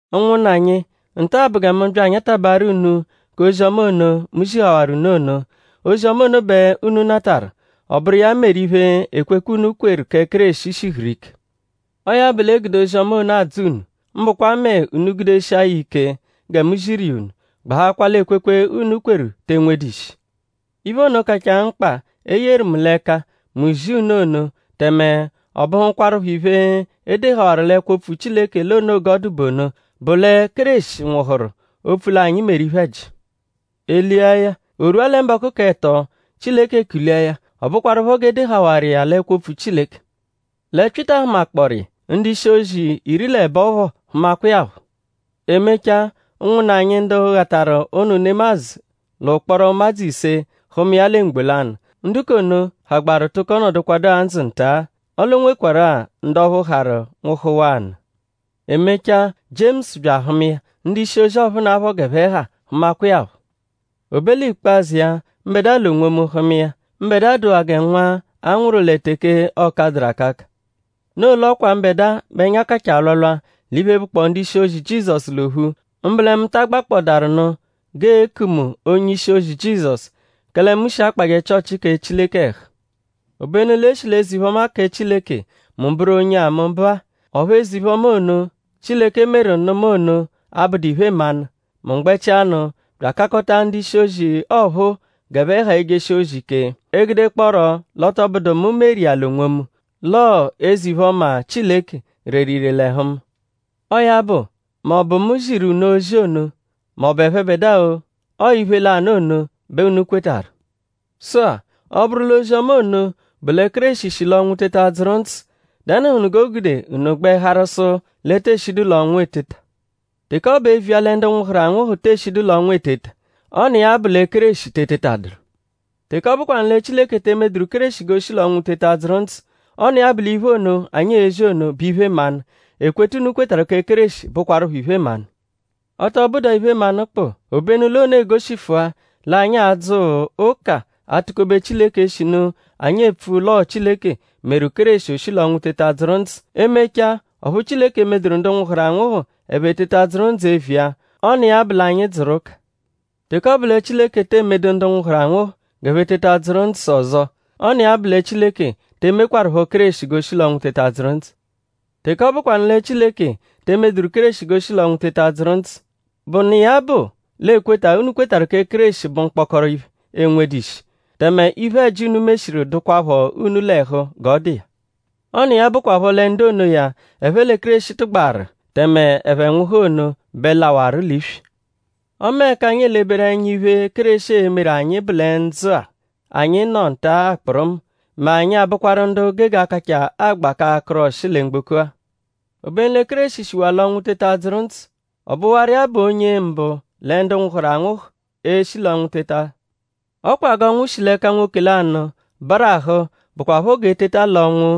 Ụnwunna anyi; nta-a bụ gẹ mu bya anyatabaaru unu k'ozi-ọma ono, mu zihawaru unu ono. Ozi-ọma ono bẹ unu natarụ; ọ bụru iya meru iphe, ekwekwe, unu kweru kẹ Kéreshi shihuru ike. Ọo ya bụ l'e gude ozi-ọma ono adzọo unu; mbụkwa mẹ unu -gudeshia ya ẹka ike gẹ mu ziru iya unu; gbahakwaa l'ekwekwe, unu kweru te enwedu ishi. Iphe ono, kachaa mkpa, e yeru mu l'ẹka; mu zia unu ono; tẹme ọ bụhukwarupho iphe, e dehawaru l'ẹkwo-opfu Chileke l'o noo g'ọo-dụ bụ ono; bụ lẹ Kéreshi nwụhuru opfu l'anyi meru iphe-ẹji. E lia ya; o rwua lẹ mbọku k'ẹto Chileke kulia ya. Ọ bụkwarupho g'e dehawaru iya l'ẹkwo-opfu Chileke. Lẹ Pyịta hụmakpooru iya; ndu-ishi-ozi iri l'ẹbo phọ hụmakwa iya phọ. E mechaa ụnwunna anyi ndu ghataru ụnu nemadzụ l'ụkporo ụmadzu ise hụma iya lẹ mgbo lanụ. Ndu k'ono hagbaru tụko nọdukwadua ndzụ nta-a; ọle o nwekwarụ-a ndu ọphu harụ nwụhuwaa nụ. E mechaa; Jiemusu bya ahụma iya; ndu-ishi-ozi ọphunapho g'ẹphe ha hụmakwa iya phọ. O be l'ikpazụ iya; mbẹdua l'onwomu hụma iya. Mbẹdua dụwaa gẹ nwa a nwụru lẹ teke ọ kadụru akaka; noo l'ọ kwa mbẹdua bẹ ẹnya kachaa alwalwa l'iphe, bụkpoo ndu-ishi-ozi Jizọsu l'ophu; mbụ lẹ mu ta agbakpọdaaru nụ g'ee-ku mu onye ishi-ozi Jizọsu; kẹle mu shi akpajẹ Chịochi kẹ Chileke ẹhu. Obenu l'e shi l'eze-iphe-ọma kẹ Chileke, mu bụru onye-a mu bụ-a; ọphu eze-iphe-ọma ono, Chileke meru nụ mu ono abụdu iphe-mmanụ. Mu gbẹchianu bya akakọta ndu-ishi-ozi ọphuu g'ẹphe ha ejeshi ozi ike; e gudekpọoro l'ọ tọ bụdu mu meru iya l'onwomu; l'ọo eze-iphe-ọma Chileke reru ire l'ẹhu mu. Ọo ya bụ; m'ọ bụ mu ziru unu ozi ono; m'ọ bụ ẹphebedua-o; ọo iphe lanụ ono bẹ unu kwetarụ. Sụ-a; ọ -bụru l'ozi-ọma ono bụ lẹ Kéreshi shi l'ọnwu teta dzụru ndzụ;?dẹnuhunu g'o gude unu gbẹ harụ sụ l'e tee shidu l'ọnwu eteta? Teke ọ bụ eviya lẹ ndu nwụhuru anwụhu tee shidu l'ọnwu eteta; ọ n'iya-a bụ lẹ Kéreshi te etetadụru. Teke ọ bụkwanu lẹ Chileke te emeduru Kéreshi g'o shi l'ọnwu teta dzụru ndzụ; ọ n'iya bụ l'iphe ono, anyi ezi ono bụ iphe-mmanụ; ekweta, unu kwetarụ kẹ Kéreshi bụkwarupho iphe-mmanụ. Ọ tọ bụdua iphe-mmanụ kpụ; obenu l'ono egoshifua l'anyi adzụ ụka atụ-kobe Chileke eshinu anyi epfu l'ọo Chileke meru Kéreshi o shi l'ọnwu teta dzụru ndzụ. E -mechaa; ọphu Chileke emeduru ndu nwụhuru anwụhu ẹphe teta dzụru ndzụ eviya; ọ n'iya bụ l'anyi dzụru ụka. Teke ọ bụ lẹ Chileke tee medu ndu nwụhuru anwụhu g'ẹphe teta dzụru ndzụ ọzo; ọ n'iya bụ lẹ Chileke te emekwarụpho Kéreshi g'o shi l'ọnwu teta dzụru ndzụ. Teke ọ bụkwanu lẹ Chileke te emeduru Kéreshi g'o shi l'ọnwu teta dzụru ndzụ; bụ n'iya bụ l'ekweta, unu kwetarụ kẹ Kéreshi bụ mkpọkoro iphe, enwedu ishi; tẹme iphe-ẹji, unu meshiru dụkwapho unu l'ẹhu g'ọ dụ iya. Ọ n'iya bụkwapho lẹ ndu onoya, ẹphe lẹ Kéreshi tụgbaru tẹme ẹphe nwụhu ono bẹ lawarụ l'iswi. Ọme ẹka anyi eleberu ẹnya iphe, Kéreshi e-meru anyi bụ lẹ ndzụ-a, anyi nọ nta-a kpụrumu; mẹ anyi a-bụkwaru ndu gege akachaa agba k'akụru ọshi lẹ mgboko-a. Obenu lẹ Kéreshi shiwaa l'ọnwu teta dzụru ndzụ. Ọ bụwaru iya bụ onye mbụ lẹ ndu nwụhuru anwụhu, e-shi l'ọnwu teta. Ọ kwa g'ọnwu shi l'ẹka nwoke lanụ barahụ bụkwapho g'eteta l'ọnwu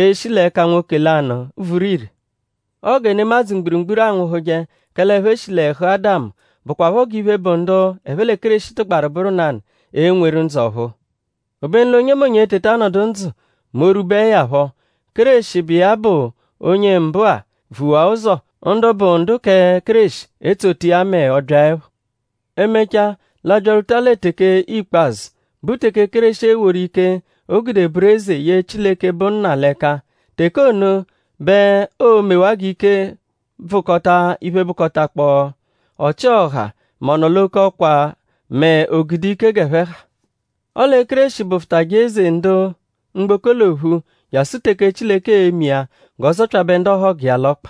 e-shi l'ẹka nwoke lanụ vuru ire. Ọo gẹ nemadzụ mgburugburu anwụhuje; kẹle ẹphe shi l'ẹhu Ádamu bụkwapho g'iphe, bụ ndu ẹphe lẹ Kéreshi tụgbaru bụru nanụ e-nweru ndzụ ọ̀phúú. Obenu l'onyemonye e-teta nọdu ndzụ mẹ o -rwubeẹ ya phọ; Kéreshi, bụ iya bụ onye mbụ-a vuwaa ụzo; ndu bụ ndu kẹ Kéreshi etsota iya mẹ ọ -byaẹpho. E -mechaa; l'a byarwuta lẹ teke ikpazụ, bụ teke Kéreshi e-woru ike, o gude bụru eze ye Chileke, bụ Nna l'ẹka; teke ono bẹ oo-mewaa g'ike bvụkota iphe, bụkotakpoo ọchi-ọha mẹ ọ-nọ-l'oke-ọkwa mẹ o-gude-ike g'ẹphe ha. Ọle Kéreshi bụfutaje eze, ndu mgboko l'ophu jasụ teke Chileke e-me iya g'ọ zọpyabe ndu ọhogu iya l'ọkpa.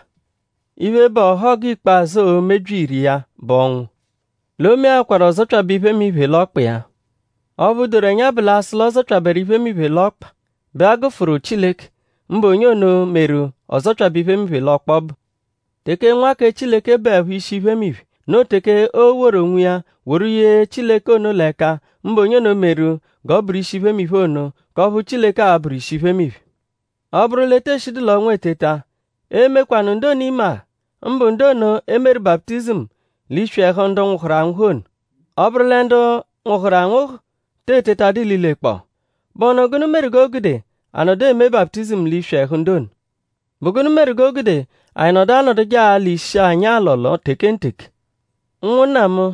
Iphe, bụ ọhogu ikpazụ, oo-mebyi ìrè iya bụ ọnwu. “L'o meakwaru ọ zọpyabe iphemiphe l'ọkpa iya.” Ọphu doru ẹnya bụ l'a -sụ l'ọ zọpyaberu “iphemiphe” l'ọkpa bẹ a gụfuru Chileke; mbụ onye ono, meru ọ zọpyabe iphemiphe l'ọkpa ọbu. Teke Nwa kẹ Chileke bụepho ishi iphemiphe; noo teke oo-woru onwiya woru ye Chileke ono l'ẹka; mbụ onye ono meru g'ọ bụru ishi iphemiphe ono; k'ọphu Chileke a-bụru ishi iphemiphe. Ọ -bụru l'e tee shidu l'ọnwu eteta;?ee-mekwanụ ndu ono imeagha? mbụ ndu ono, e meru baputizimu l'iswi ẹhu ndu nwụhuru anwụhu ono? Ọ -bụru lẹ ndu nwụhuru anwụhu te etetadụ ililekpọo;?bụhunu gụnu meru g'o gude a nọdu eme baputizimu l'iswi ẹhu ndu ono? ?Bụ gụnu meru g'o gude anyi nọdu anọduje alọ ishi anyi alọlo tekenteke? Ụnwunna mu;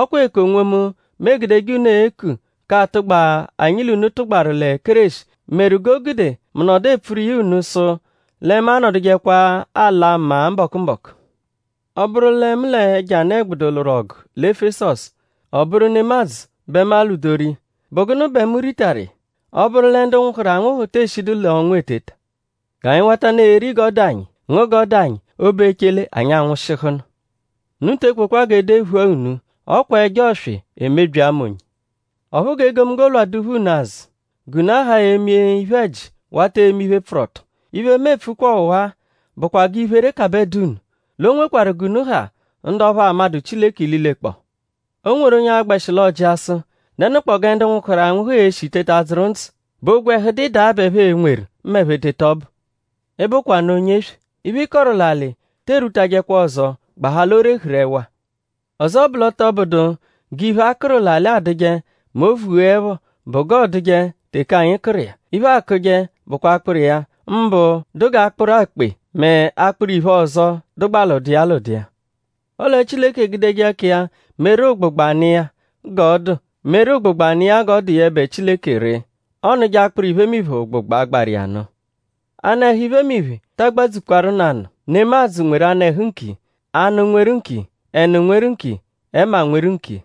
ọ kwa eku onwomu, mu egudeje unu eku k'atụgba, anyi l'unu tụgbaru lẹ Kéreshi meru g'o gude mu nọdu epfuru iya unu sụ lẹ mu anọdujekwa ala maa mbọku-mbọku. Ọ -bụru lẹ mu l'ẹjo anụ-ẹgbudu lwụru ọgu lẹ Efesọsu ọ bụru nemadzụ bẹ mu alwụdoru iya;?bụ gụnu bẹ mu ritaru iya? Ọ -bụru lẹ ndu nwụhuru anwụhu tee shidu l'ọnwu eteta; “G'anyi watanụ eri g'ọ dụ anyi; ngụ g'ọ dụ anyi; o -be echele; anyi anwụshihunu.” Unu te ekwekwa g'e dephua unu. “Ọ kwa ẹjo ọswi emebyi ama onye.” Ọphu g'egomunggo lwadụpho unu azụ; g'unu ahaa eme iphe-ẹji wata eme iphe, pfụru ọto. Iphe, mu epfukwa ọwa-a bụkwa g'iphere kabẹ dụ unu. L'o nwekwarụ g'unu ha ndu ọphu amadụ Chileke ililekpọo. O nweru onye a-gbẹshi l'ọ jịa sụ:?Dẹnukpoo gẹ ndu nwụhuru anwụhu e-shi teta dzụru ndzụ??Bụ ogwẹhu dụ ịdagha bẹ ẹphe e-nweru m'ẹphe teta ọbu? Ị bụkwanu onye-eswe! Iphe, ị kọru l'alị te erwutajẹkwa ọzo gbahaa l'o rehuru ẹwa Ọzo bụ l'ọ tọ bụdu g'iphe, a kụru l'alị adụje mẹ o -vugheẹpho bụ g'ọoduje teke anyi kụru iya. Iphe, akụje bụkwa akpụru iya; mbụ dụ g'akpụru akpe mẹ akpụru-iphe ọzo, dụgbaa l'ụdu iya l'ụdu iya. Ọle Chileke egudeje ẹka iya meru ụgbugba nụ iya g'ọ dụ yẹbe Chileke ree; ọ nụje akpụru iphemiphe ụgbugba, gbaru iya nụ. Anụehu iphemiphe ta agbadzukwarụ nanụ. Nemadzụ nweru anụ-ẹhu nkiya; anụ nweru nkiya; ẹnu nweru nkiya; ẹma nweru nkiya.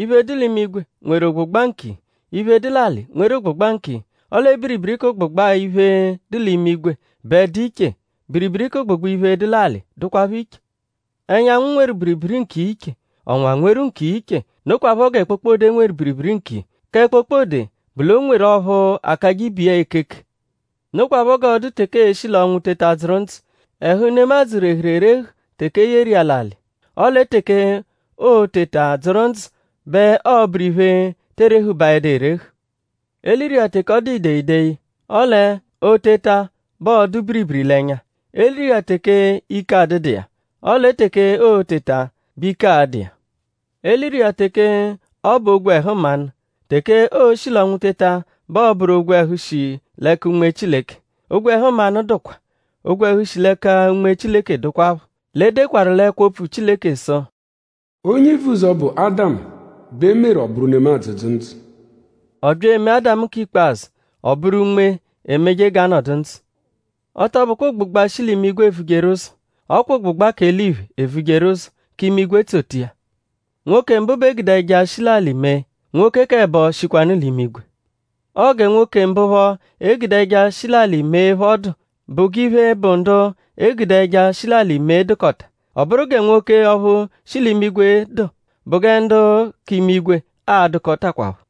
Iphe, dụ l'imigwe nweru ụgbugba nkiya. Iphe, dụ l'alị nweru ụgbugba nkiya. Ọle biribiri k'ụgbugba iphe, dụ l'imigwe bẹ dụ iche; biribiri k'ụgbugba iphe, dụ l'alị dụkwapho iche. Ẹnyanwu nweru biribiri nkiya iche; ọnwa nweru nkiya iche; nokwaphọ gẹ kpokpode nweru biribiri nkiya. Kẹ kpokpode bụ l'o nweru ọphu akajẹ ibe iya ekeke. Nokwaphọ g'ọo-dụ teke ee-shi l'ọnwu teta dzụru ndzụ. Ẹhu nemadzụ rehuru erehu teke e yeru iya l'alị. Ọle teke oo-teta dzụru ndzụ bẹ ọo-bụru iphe, tee rehubaẹdu erehu. E liru iya teke ọ dụ ideyideyi; ọle o -teta bẹ ọo-dụ biribiri l'ẹnya. E liru iya teke ike adụdu iya; ọle teke oo-teta bẹ ike a-dụ iya. E liru iya teke ọ bụ ogwẹhu mmanụ; teke o-shi l'ọnwu teta bẹ ọo-bụru ogwẹhu, shi l'ẹka Unme Chileke. Ogwẹhu mmanụ dụkwa; ogwẹhu shi l'ẹka Unme Chileke dụkwapho. L'e dekwaru l'ẹkwo-opfu Chileke sụ: “Onye ivuzọ, bụ Ádamu bẹ e meru ọ bụru nemadzụ, dzụ ndzụ.” Ọ bya emee Ádamu k'ikpazụ, ọ bụru unme, emeje g'anọdu ndzụ. Ọ tọ bụkwa ụgbugba, shi l'imigwe evujeru ụzo; ọ kwa ụgbugba k'eliphe evujeru ụzo; k'imigwe etsota iya. Nwoke mbụ bẹ e gude ẹja, shi l'alị mee; nwoke k'ẹbo shikwanụ l'imigwe. Ọo gẹ nwoke mbụ phọ e gude ẹja, shi l'alị mee phọ dụ; bụ g'iphe, bụ ndu e gude ẹja, shi l'alị mee dụkota. Ọ bụru gẹ nwoke ọphu shi l'imigwe dụ; bụ gẹ ndu k'imigwe a-dụkotakwapho.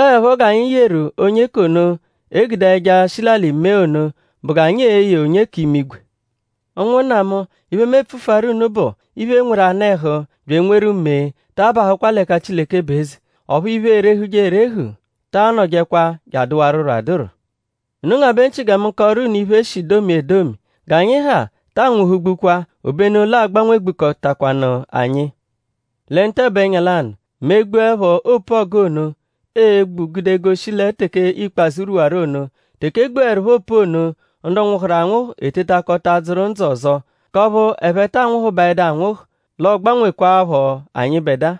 Ọo 'ẹpho g'anyi yeru onye k'ono, e gude ẹja, shi l'alị mee ono bụ g'anyi e-ye onye k'imigwe. Ụnwunna mu; iphe, mu e-pfufuaru unu bụ; iphe, nweru anụ-ẹhu bya enweru mee taa bahụkwa l'ẹka Chileke bụ eze. Ọphu iphe, erehuje erehu ta anọjekwa je adụwaruro adụru. Unu ngabẹ nchị gẹ mu kọoru unu iphe, e shi domia edomi. G'anyi ha taa nwụhugbukwa; obenu l'aa-gbanwegbukọtakwanu anyi lẹ ntabu-ẹnya lanụ mẹ e -gbuẹpho opu-ọgu ono, ee-gbu gude goshi lẹ teke ikpazụ rwuwaru ono. Teke e gbuẹrupho opu ono; ndu nwụhuru anwụhu etetakọta dzụru ndzụ ọzo; k'ọphu ẹphe taa nwụhubaedu anwụhu; l'ọ gbanwekwaaphọ anyịbedua.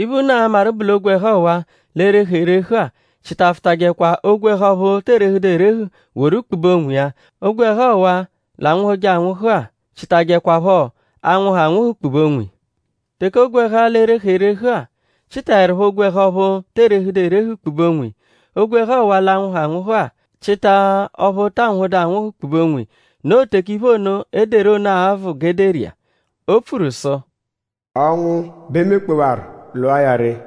Iphe, unu a-maru bụ l'ogwẹhu ọwa-a, l'e-rehu erehu-a; chịtafutajekwa ogwẹhu ọphu tee rehuhẹdu erehu woru kpube onwiya. Ogwẹhu ọwa-a, l'anwụhuje anwụhu-a chịtajekwapho 'anwụhu anwụhu kpube onwiya. Teke ogwẹhu-a, l'e-rehu erehu-a chịtaerupho ogwẹhu ọphu tee rehudu erehu kpube onwiya; ogwẹhu ọwa-a, l'anwụhu anwụhu-a chịta ọphu taa nwụhudu anwụhu kpube onwiya; noo teke iphe ono, e deru ono a-vụ g'e deru iya. O pfuru sụ: “Ọnwu bẹ emekpewaru; lwụa ya ree.”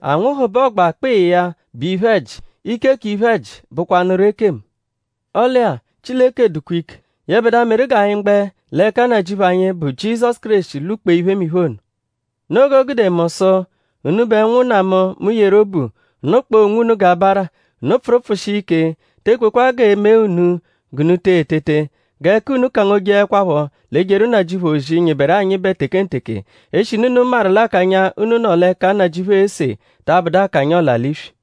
Anwụhu bẹ ọgba-kpịi ya bụ iphe-ẹji; ike k'iphe-ẹji bụkwanuru ekemu. Ọle-a; Chileke dụkwa ike; yẹbedua meru g'anyi gbẹ l'ẹka Nnajịuphu anyi, bụ Jizọsu Kéreshi lwụ-kpee iphemiphe ono. Noo g'o gude mu sụ: unubẹ ụnwunna mu, mu yeru obu; unu kpọo onwunu g'abara. Unu pfụru pfụshia ike; te ekwekwa g'e mee unu g'unu te etete. G'ẹka unu kangojeẹkwapho l'ejeru Nnajịuphu ozi, nyịberu anyịbe tekenteke; eshinu unu maru l'akanya, unu nọ l'ẹka Nnajịuphu ese ta abụdu akanya ọla-l'iswi.